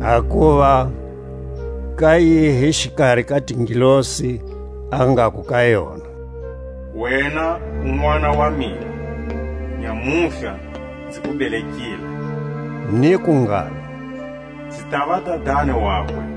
Hakuva ka yihi xikari ka tingelosi a ngaku ka yona: Wena u Nʼwana wa mina, Nyamutlha nzi ku belekile? Niku ngalo: Nzi tava Dadani wakwe,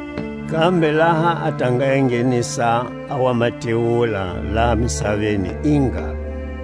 Kambe laha a ta nga enghenisa a wa matewula laha misaveni i ngalo: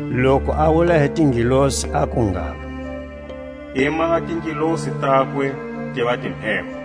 Loku a wula hi tingelosi aku ngalo: I maha tingelosi takwe tiva timheho,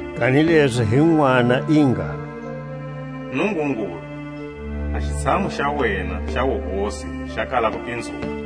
Kanilezi hi Nʼwana i ngalo: Nungungulu, a xitshamu xa wena xa wuhosi xa kala kupinzuka,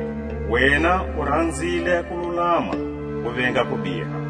Wena u ranzile kululama, u venga kubiha;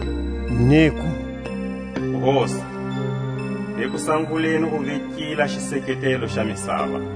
Niku: Hosi, hi kusanguleni u vekile a xiseketelo xa misava,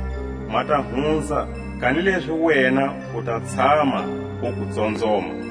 Ma ta hunza, kanilezi wena u ta tshama uku tsonzoma,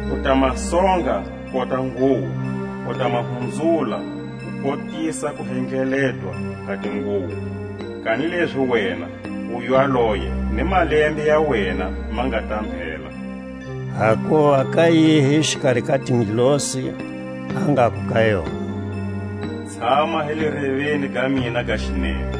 U ta ma songa kota nguwo, U ta ma hunzula kukotisa kuhendleletwa ka tinguwo; Kanilezi wena u ywaloye, Ni malembe ya wena ma nga ta mbhela. Hakuva ka yihi xikari ka tingelosi a ngaku ka yona: Tshama hi le reveni ga mina ga xinene,